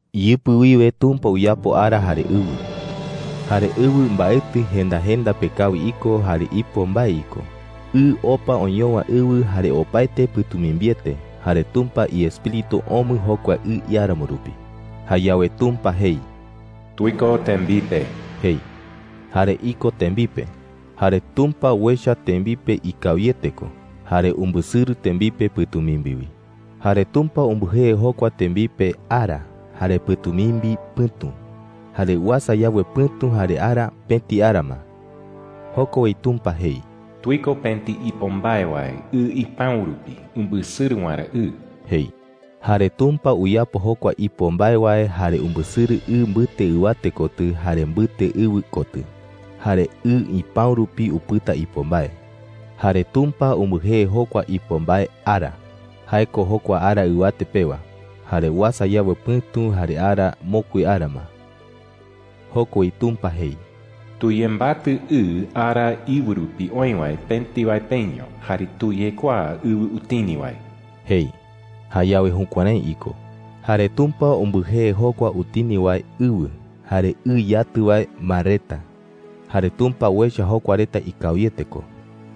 Iyɨpɨ wiwe Tumpa uyapo ara jare ɨwɨ. Jare ɨwɨ mbaetɨ jenda jenda pe kawi iko jare ipo mbae iko. Ɨ opa oñowa ɨwɨ jare opaete pɨ̈tumimbiete. Jare Tumpa iEspíritu omɨ jokua ɨ iáramo rupi. Jayawe Tumpa jei: “¡Tuiko tembipe!” jei. Jare iko tembipe. Jare Tumpa uecha tembipe ikawiete ko. Jare umbɨsɨrɨ tembipe pɨ̈tumimbi wi. Jare Tumpa umbɨjee jokua tembipe, “ara,” jare pɨ̈tumimbi, “pɨ̈tu.” Jare uasa yawe pɨ̈tu jare ara, pëti ara ma. Joko wi Tumpa jei: “Tuiko pëti ipo mbae wae ɨ ipäu rupi umbɨsɨrɨ waerä ɨ,” jei. Jare Tumpa uyapo jokua ipo mbae wae jare umbɨsɨrɨ ɨ mbɨte ɨwate kotɨ jare mbɨte ɨwɨ kotɨ. Jare ɨ ipäu rupi upɨta ipo mbae. Jare Tumpa umbɨjee jokua ipo mbae “ara” – jae ko jokua ara ɨwate pewa. Jare uasa yawe pɨ̈tu jare ara, mokui ara ma. Joko wi Tumpa jei: “Tuyembatɨ ɨ ara íɨwɨ rupi oï wae pëti wae peño, jare tuyekuaa ɨwɨ utini wae,” jei. Jayawe jukuärái iko. Jare Tumpa umbɨjee jokua utini wae, “ɨwɨ,” jare ɨ yatɨ wae, “mar reta.” Jare Tumpa uecha jokua reta ikawiete ko.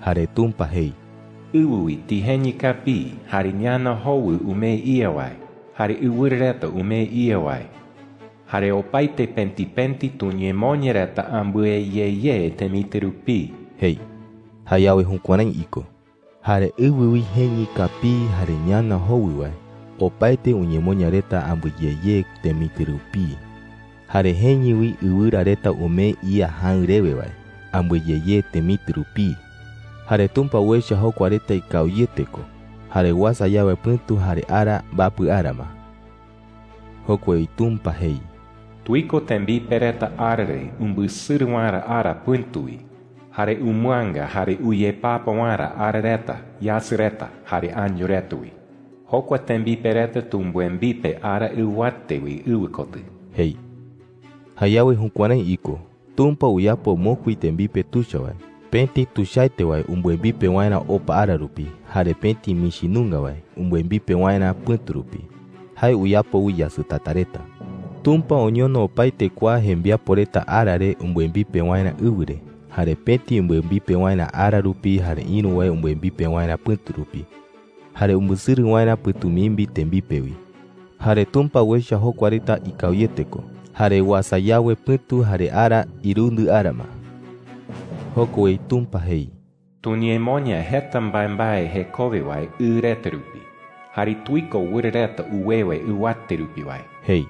Jare Tumpa jei: “Ɨwɨ wi tijeñɨ kapii, jare ñana jowɨ umee ía wae, jare ɨwɨra reta umee ía wae,” jei. “Jare opaete pëti pëti tuñemoña reta ambɨe ye ye temitɨ rupii,” jei. Jayawe jukuärái iko. Jare ɨwɨ wi jeñɨ kapii jare ñana jowɨ wae, opaete uñemoña reta ambɨe ye ye temitɨ rupii. Jare jeñɨ wi ɨwɨra reta umee ía jäɨ rewe wae, ambɨe ye ye temitɨ rupii. Jare Tumpa uecha jokua reta ikawiete ko. Jare uasa yawe pɨ̈tu jare ara, mbapɨ ara ma. Joko wi Tumpa jei: “Tuiko tembipe reta ara re umbɨsɨrɨ waerä ara pɨ̈tu wi, jare umɨanga jare uyepapa waerä ara reta, yasɨ reta, jare año reta wi. Jokua tembipe reta tumbɨembipe ara ɨwate wi ɨwɨ kotɨ,” jei. Jayawe jukuärái iko. Tumpa uyapo mokui tembipe tuicha wae – pëti tuichaete wae umbɨembipe waerä opa ara rupi, jare pëti michi nunga wae umbɨembipe waerä pɨ̈tu rupi. Jae uyapo wi yasɨtata reta. Tumpa oñono opaete kua jembiapo reta ara re umbɨembipe waerä ɨwɨ re, jare pëti umbɨembipe waerä ara rupi jare ïru wae umbɨembipe waerä pɨ̈tu rupi, jare umbɨsɨrɨ waerä pɨ̈tumimbi tembipe wi. Jare Tumpa uecha jokua reta ikawiete ko. Jare uasa yawe pɨ̈tu jare ara, irundɨ ara ma. Joko wi Tumpa jei: “Tuñemoña jeta mbaembae jekowe wae ɨ reta rupi, jare tuiko wɨra reta uwewe ɨwate rupi wae,” jei.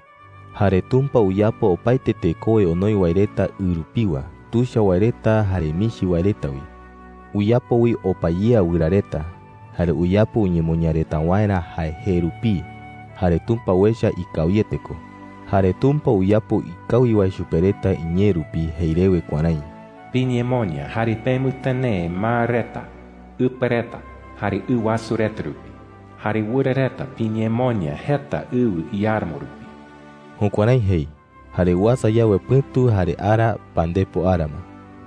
Jare Tumpa uyapo opaete tekowe onoi wae reta ɨ rupiwa – tuicha wae reta jare michi wae reta wi. Uyapo wi opa yea wɨra reta. Jare uyapo uñemoña reta waerä jae jee rupii. Jare Tumpa uecha ikawiete ko. Jare Tumpa uyapo ikawi wae chupe reta iñee rupi jei rewe kuärái: “Piñemoña jare pemɨtɨnee mar reta, ɨpa reta, jare ɨ wasu reta rupi. Jare wɨra reta piñemoña jeta ɨwɨ iáramo rupi.” Jukuärái jei. Jare uasa yawe pɨ̈tu jare ara, pandepo ara ma.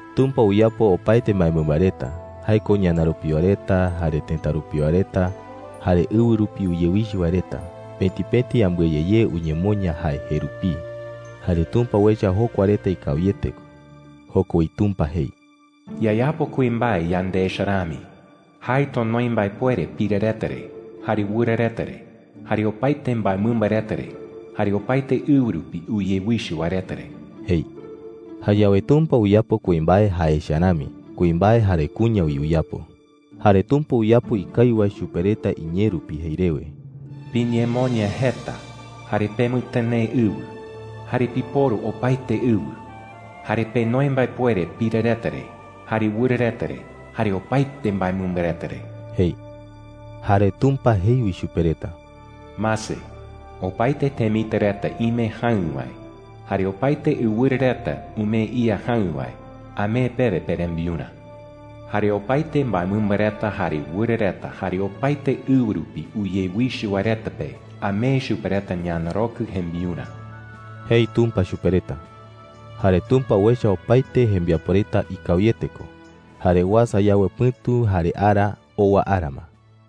Tumpa uyapo opaete mbaemɨmba reta – jae ko ñana rupiwa reta, jare tëta rupiwa reta, jare ɨwɨ rupi uyewichɨ wae reta – pëti pëti ambɨe ye ye uñemoña jae jee rupii. Jare Tumpa uecha jokua reta ikawiete ko. Joko wi Tumpa jei: “Yayapo kuimbae yande echa rami. Jae tonoi mbaepuere pira reta re, jare wɨra reta re, jare opaete mbaemɨmba reta re, jare opaete ɨwɨ rupi uyewichɨ wae reta re,” jei. Jayawe Tumpa uyapo kuimbae jae echa rami. Kuimbae jare kuña wi uyapo. Jare Tumpa uyapo ikawi wae chupe reta iñee rupi jei rewe: “Piñemoña jeta jare pemɨtɨnee ɨwɨ, jare piporu opaete ɨwɨ. Jare penoi mbaepuere pira reta re, jare wɨra reta re, jare opaete mbaemɨmba reta re,” jei. Jare Tumpa jei wi chupe reta: “Mase, opaete temitɨ reta ime jäɨ wae jare opaete ɨwɨra reta umee ía jäɨ wae amee pewe perembiurä. Jare opaete mbaemɨmba reta jare wɨra reta jare opaete ɨwɨ rupi uyewichɨ wae reta pe, amee chupe reta ñanarokɨ jembiurä,” jei Tumpa chupe reta. Jare Tumpa uecha opaete jembiapo reta ikawiete ko. Jare uasa yawe pɨ̈tu jare ara, owa ara ma.